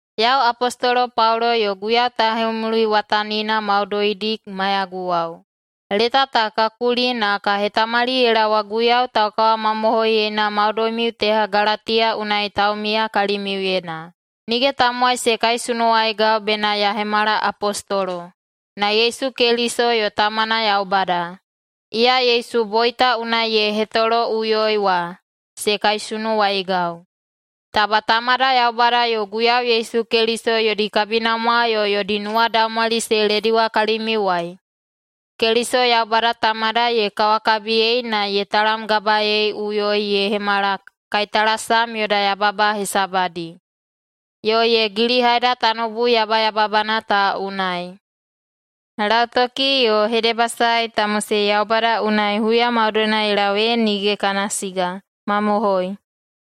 Yau Apostolo Paulo yo Guiyau tauhemuliwatanina maudoidi maiyaguwao, leta ta ka kuli na ka hetamali ye laowa Guiyau taukawamamohoiyena maudoimiu teha Galatiya unai taumiya kalimiuyena. Nige tamowai se kaisunuwaigau bena ya hemala apostolo, na Yesu Keliso yo Tamana Yaubada, iya Yesu boita unai ye hetoloꞌuyoi wa, se kaisunuwaigau. Taba Tamada Yaubada yo Guiyau Yesu Keliso yodi kabinamwa yo yodi nuwadaumwali se lediwa kalimiuwai. Keliso Yaubada Tamada ye kawakabiyei na ye talamgabaeiꞌuyoi ye hemala kaitalasam yoda yababa hesabadi, yo ye gilihaida tanoubu yabayababana ta unai. Lautoki yo hedebasae ta mosei Yaubada unai huya maudoina ye lau ee nige kana siga. Mamohoi!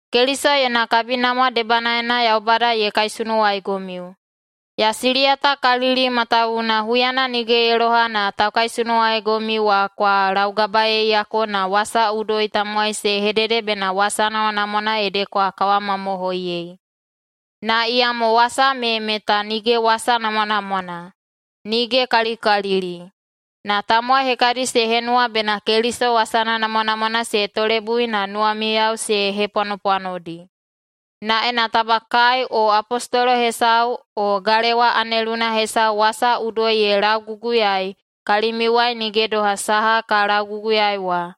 Keliso yona kabinamwa debanaena Yaubada ye kaisunuwaigomiu. Ya siliyatakalili matawuwuna huyana nige ye loha na taukaisunuwaigomiu wa kwa laugabaeiyako na wasa udoi tamowai se hedede bena wasa namwanamwana ede kwa kawamamohoiyei. Na iyamo wasa me meta nige wasa namwanamwana, nigekalikalili! Na tamowai hekadi se henuwa bena Keliso wasana namwanamwana se tolebui na nuwamiyao se hepwanopwanodi. Na ena taba kai o apostolo hesau o galewa aneluna hesau wasa udoi ye lauguguyaei kalimiuwai nige doha saha ka lauguguyaei wa,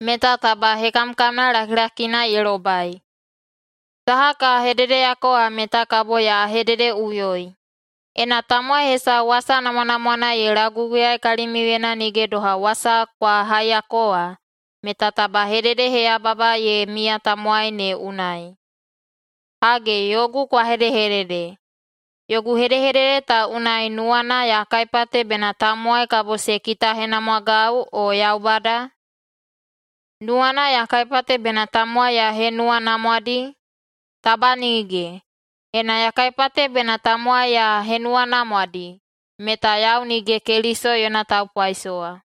meta taba hekamkamna lakilakina ye lobai. Saha ka hededeyako wa meta kabo ya hededeꞌuyoi: Ena tamowai hesau wasa namwanamwana ye lauguguyai kalimiuyena nige doha wasa kwa haiyako wa, meta taba hededeheyababa ye miya tamowaina ne unai. Hage, yogu kwa hedehedede: Yogu hedehedede ta unai nuwana ya kaipate bena tamowai kabo se kitahenamwagau, o Yaubada? Nuwana ya kaipate bena tamowai ya henuwanamwadi? Taba nige! Ena ya kaipate bena tamowai ya henuwanamwadi, meta yau nige Keliso yona taupaisowa.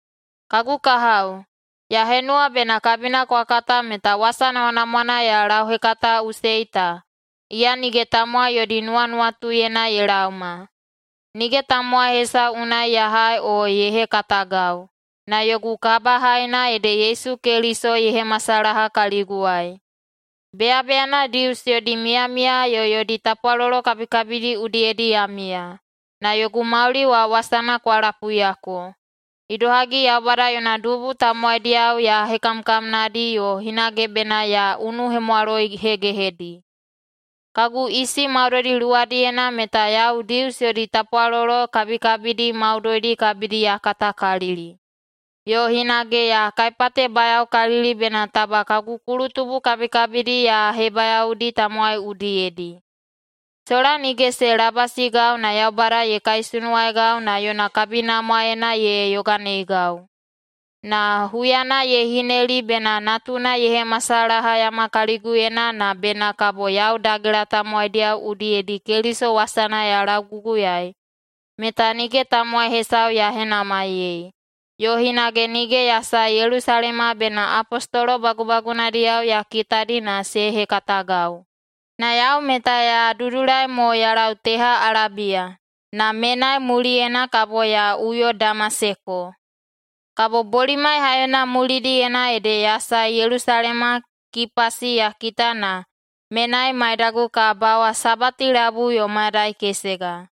Kagu kahao, ya henuwa bena kabina kwa kata meta wasa namwanamwana ya lauhekataꞌusei ta, iya nige tamowai yodi nuwanuwatuyena ye laoma. Nige tamowai hesau unai ya hai o ye hekatagau, na yogu kabahaina ede Yesu Keliso ye hemasalaha kaliguwai. Beyabeyana Dius yodi miyamiya yo yodi tapwalolo kabikabidi udiyedi ya miya, na yogu mauli wa wasana kwa lapuiyako, idohagi Yaubada yona dubu tamowaidiyao ya hekamkamnadi yo hinage bena ya unuhemwaloihegehedi. Kagu isi maudoidi luwadiyena meta yau Dius yodi tapwalolo kabikabidi maudoidi kabidi ya katakalili, yo hinage ya kaipatebayaokalili bena taba kagu kulutubu kabikabidi ya hebayaodi tamowai udiyedi. Sola nige se labasigau na Yaubada ye kaisunuwaigau na yona kabinamwaena ye yoganeigau. Na huyana ye hineli bena natuna ye hemasalahayama kaliguyena na bena kabo yau dagela tamowaidiyao udiyedi Keliso wasana ya lauguguyaei, meta nige tamowai hesau ya henamaiyei, yo hinage nige ya sae Yelusalema bena apostolo bagubagunadiyao ya kitadi na se hekatagau. Na yau meta ya dudulai mo ya lau teha Alabiya, na menai muliyena kabo ya uyo Damaseko. Kabo bolimai haiyona mulidiyena ede ya sae Yelusalema, Kipasi ya kita na menai maidagu ka bawa sabati labui yo mayadai kesega.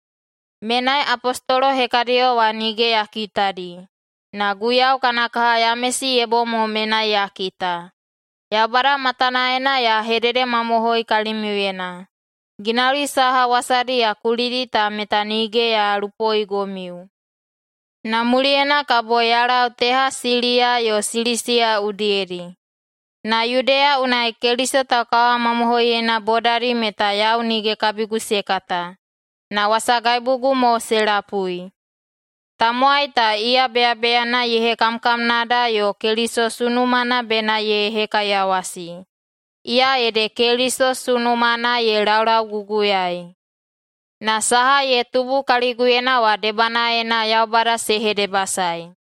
Menai apostolo hekadiyo wa nige ya kitadi, na Guiyau kana kaha Yamesi ye bom mo menai ya kita. Yaubada matanaena ya hededemamohoi kalimiuyena: Ginauli saha wasadi ya kulidi ta meta nige ya lupoigomiu. Na muliyena kabo ya lau teha Siliya yo Silisiya udiyedi. Na Yudeya unai Keliso taukawamamohoiyena bodadi meta yau nige kabigu se kata. Na wasagaibugu mo se lapui, “Tamowai ta, iya beyabeyana ye hekamkamnada yo Keliso sunumana bena ye hekaiyawasi, iya ede Keliso sunumana ye laulauguguyaei.” Na saha ye tubu kaliguyena wa debanaena Yaubada se hedebasaei.